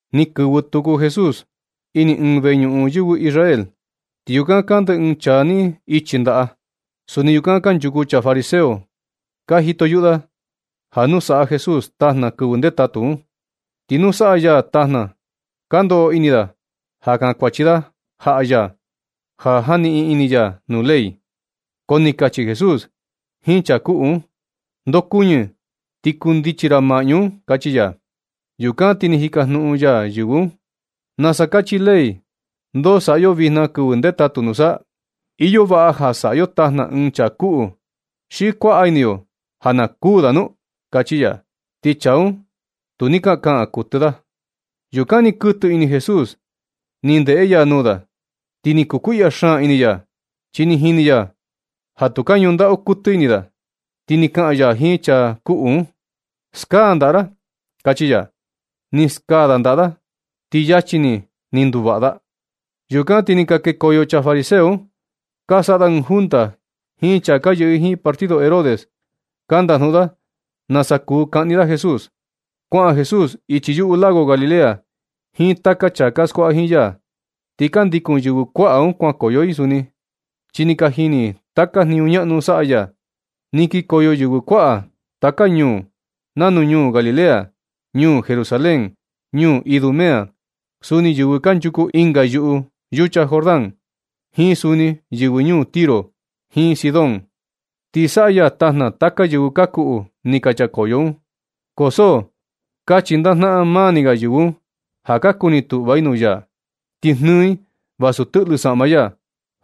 Ni kɨvɨ tuku Jesús ini ɨɨn veñuꞌun yɨvɨ Israel, ti yukan kande ɨɨn chaa ni ichi ndaꞌa. Suni yukan kanchuku chaa fariseo ka iyo listo da ja nu saꞌa Jesús tajna kɨvɨ ndetatu un. Ti nu na saꞌa ya tajna, ka ndoꞌo ini da ja kankuachi da jaꞌa ya ja janiꞌin ini ya nuu ley. Ko ni kachi Jesús jiin chaa kuꞌu un: ―Ndokuñɨ, ti kundichi ra maꞌñu un ―kachi ya. Yukan ti ni jikajnuꞌun ya yɨvɨ un: ―¿Nasa kachi ley ndoo saꞌa yo vijna kɨvɨ ndetatu nusa? ¿Iyo vaꞌa ja saꞌa yo tajna ɨɨn chaa kuꞌu xi kuaꞌa ini yo na kuū da nu? ―kachi ya. Ti chaa un tu ni ka kaꞌan kuɨtɨ da. Yukan ni kɨtɨ ini Jesús ni ndeꞌe ya nuu da, ti ni kukuiꞌya xaan ini ya, chi ni jini ya ja tu ka ñuꞌun ndaꞌu kɨtɨ ini da. Ti ni kaꞌan ya jiin chaa kuꞌu un: ―Skaa ndaꞌa ra ―kachi ya. Ni skaa da ndaꞌa da. Ti luego ni, ni nduvaꞌa. Yukan ti ni ka kekoyo chaa fariseo un, ka saꞌa da ɨɨn junta jiin chaa ka yɨꞌɨ i jiin partido Herodes. Ka ndajnuꞌun da nasa kuu kaꞌni da Jesús. Kuaꞌan Jesús ichi yuꞌu lago Galilea jiin taka chaa ka skuaꞌa jiin ya. Ti ka ndikun yɨvɨ kuaꞌa un kuankoyo i suni, chi ni ka jini i taka jniñu ñaꞌnu saꞌa ya. Ni kikoyo yɨvɨ kuaꞌa taka ñuu nanu ñuu Galilea, ñuu Jerusalén, ñuu Idumea. Suni yɨvɨ kanchuku ɨnga yuꞌu yucha Jordán, jiin suni yɨvɨ ñuu Tiro jiin Sidón. Ti saꞌa ya tajna taka yɨvɨ ka kuꞌu ni ka chakoyo un, ko so ka chindajnaꞌan maa ni ga yɨvɨ un ja ka kuni tuꞌva i nuu ya, ti jnɨɨ i vasu tɨꞌlɨ saꞌma ya,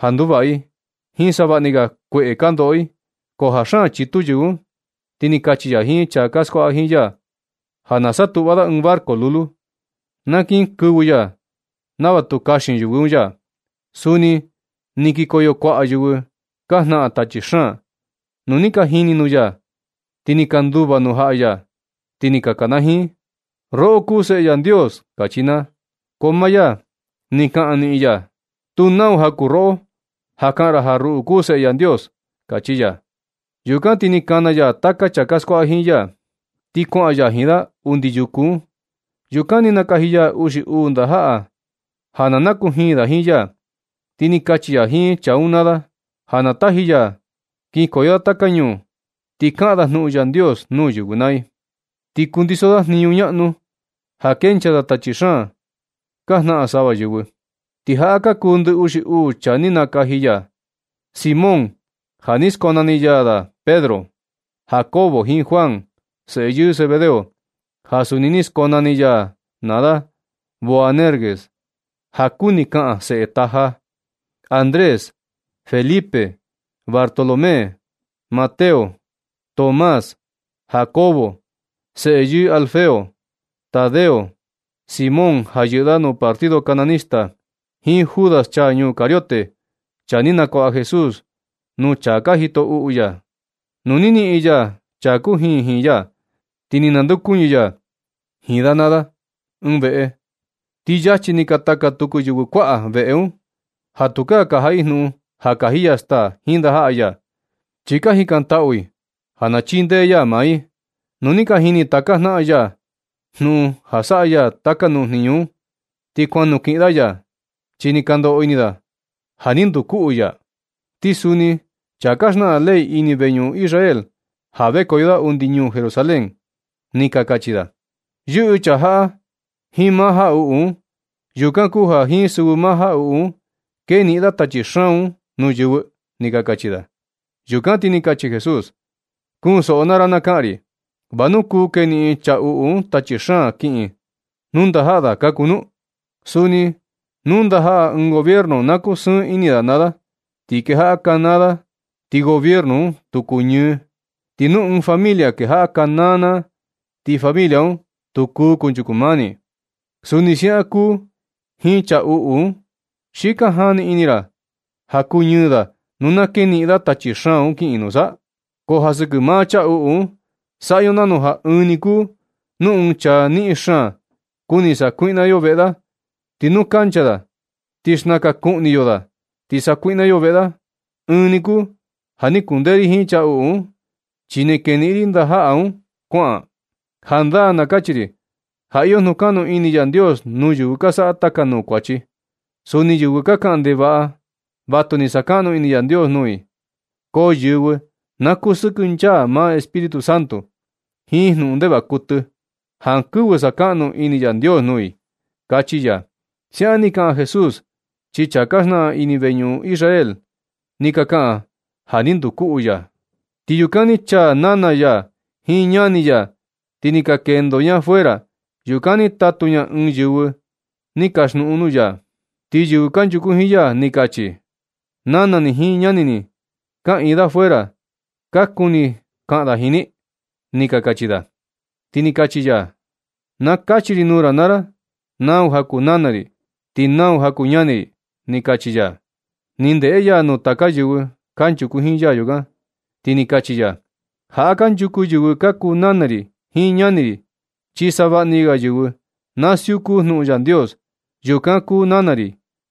ja nduvaꞌa i jiin savaꞌa ni ga kueꞌe ka ndoꞌo i. Ko ja xaan chitu yɨvɨ un, ti ni kachi ya jiin chaa ka skuaꞌa jiin ya ja na satuꞌva da ɨɨn barco lulu, na kinkɨvɨ ya nava tu kaxin yɨvɨ un ya. Suni ni kikoyo kuaꞌa yɨvɨ ka jnaꞌan tachi xaan. Nu ni ka jini nuu ya, ti ni ka nduva nuu jaꞌa ya. Ti ni ka kanajiin: ―¡Roꞌo kuu Seꞌe Yandios! ―kachi naa. Ko maa ya ni kaꞌan niꞌin ya: ―Tu nau ja kuu roꞌo ja kaꞌan ra ja ruꞌu kuu Seꞌe Yandios ―kachi ya. Yukan ti ni kana ya taka chaa ka skuaꞌa jiin ya, ti kuaꞌan ya jiin da undi yuku un. Yukan ni nakaji ya uxi uu ndajaꞌa ja na nakujin da jiin ya. Ti ni kachi ya jiin chaa un naa da ja na taji ya da kinkoyo da taka ñuu, ti kaꞌan da jnuꞌun Yandios nuu yɨvɨ naa i. Ti kundiso da jniñu ñaꞌnu ja kenchaa da tachi xaan ka jnaꞌan sava yɨvɨ. Ti jaꞌa ka kuu ndɨ uxi uu chaa ni nakaji ya: Simón ja ni skonani ya da Pedro; Jacobo jiin Juan, seꞌe yɨɨ Zebedeo, ja suni ni skonani ya da naa da Boanerges, ja kuni kaꞌan seꞌe taja; Andrés; Felipe; Bartolomé; Mateo; Tomás; Jacobo, seꞌe yɨɨ Alfeo; Tadeo; Simón, ja yɨꞌɨ da nuu partido cananista; jiin Judas, chaa ñuu Cariote, chaa ni nakuaꞌa Jesús nuu chaa ka jito uꞌu ya. Nu ni niꞌin ya chaa kujin jiin ya, ti ni nandeokuñɨ ya jiin da naa da ɨɨn veꞌe. Ti yachi ni kataka tuku yɨvɨ kuaꞌa veꞌe un, ja tu ka jaꞌa i jnuꞌun ja kaji ya staa jiin ndajaꞌa ya, chi ka jikantaꞌu i ja na chindee ya maa i. Nu ni ka jini taka jnaꞌan ya jnuꞌun ja saꞌa ya taka nuu jniñu un, ti kuan nukiꞌin da ya, chi ni ka ndoꞌo ini da ja ni nduu kuꞌu ya. Ti suni chaa ka xnaꞌan ley ini veñuꞌun yɨvɨ Israel ja vekoyo da undi ñuu Jerusalén, ni ka kachi da: ―Yɨꞌɨ chaa jaꞌa jiin maa jaꞌuꞌu un. Yukan kuu ja jiin sɨvɨ maa jaꞌuꞌu un keniꞌin da tachi xaan un nuu yɨvɨ ―ni ka kachi da. Yukan ti ni kachi Jesús: ―Kunsoꞌo naa ra na kaꞌan ri. ¿Va nu kuu keniꞌin chaa uꞌu un tachi xaan kiꞌin ti nu ndajaꞌa da ka kuu nu? Suni nu ndajaꞌa ɨɨn gobierno, na kusɨɨn ini da naa da ti kejaꞌa kanaa da, ti gobierno un tu kuñɨɨ. Ti nu ɨɨn familia kejaꞌa kanaa naa, ti familia un tu kuu kunchuku mani. Suni siaꞌan kuu jiin chaa uꞌu un. ¿Xi ka jani ini ra ja na kuñɨɨ da nu na keniꞌin da tachi xaan un kiꞌin, nusa? Ko ja sɨkɨ maa chaa uꞌu un, saꞌa yo nanu ja ɨɨn ni kuu nu ɨɨn chaa niꞌin xaan, kuni sakuiꞌna yo veꞌe da, ti nu kancha da, ti xnakan kuꞌni yo da, sa sakuiꞌna yo veꞌe da. Ɨɨn ni kuu ja ni kundee ri jiin chaa uꞌu un, chi ni keniꞌin ri ndajaꞌa da un kuaꞌan. Jandaa na kachi ri ja iyo jnukaꞌnu ini Yandios nuu yɨvɨ ka saꞌa taka nuu kuachi. Suni yɨvɨ ka kaꞌan ndevaꞌa, vatu ni sakaꞌnu ini Yandios nuu i. Ko yɨvɨ na kusɨkɨnchaa maa Espíritu Santo jiin jnuꞌun ndevaꞌa kuɨtɨ, jankɨvɨ sakaꞌnu ini Yandios nuu i ―kachi ya. Siaꞌan ni kaꞌan Jesús, chi chaa ka xnaꞌan ini veñuꞌun Israel ni ka kaꞌan ja ja ni nduu uꞌu ya. Ti yukan ni chaa nana ya jiin ñani ya, ti ni ka kendo ña fuera. Yukan ni tatu ña ɨɨn yɨvɨ ni kaxnuꞌun nuu ya. Ti yɨvɨ kanchuku jiin ya ni ka kachi: ―Nana ni jiin ñani ni ka kaꞌiin da fuera. Ka kuni kaꞌan da jiin ni ―ni ka kachi da. Ti ni kachi ya: ―Na kachi ri nuu ra naa ra nau ja kuu nana ri, ti nau ja ka kuu ñani ri ―ni kachi ya. Ti ni ndeꞌe ya nuu taka yɨvɨ kanchuku jiin ya yukan, ti ni kachi ya: ―Jaꞌa kanchuku yɨvɨ ka kuu nana ri jiin ñani ri. Chi savaꞌni ga yɨvɨ na siuku jnuꞌun Yandios, yukan kuu nana ri,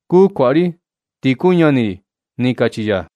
kuu kuaꞌa ri, ti kuu ñani ri ―ni kachi ya.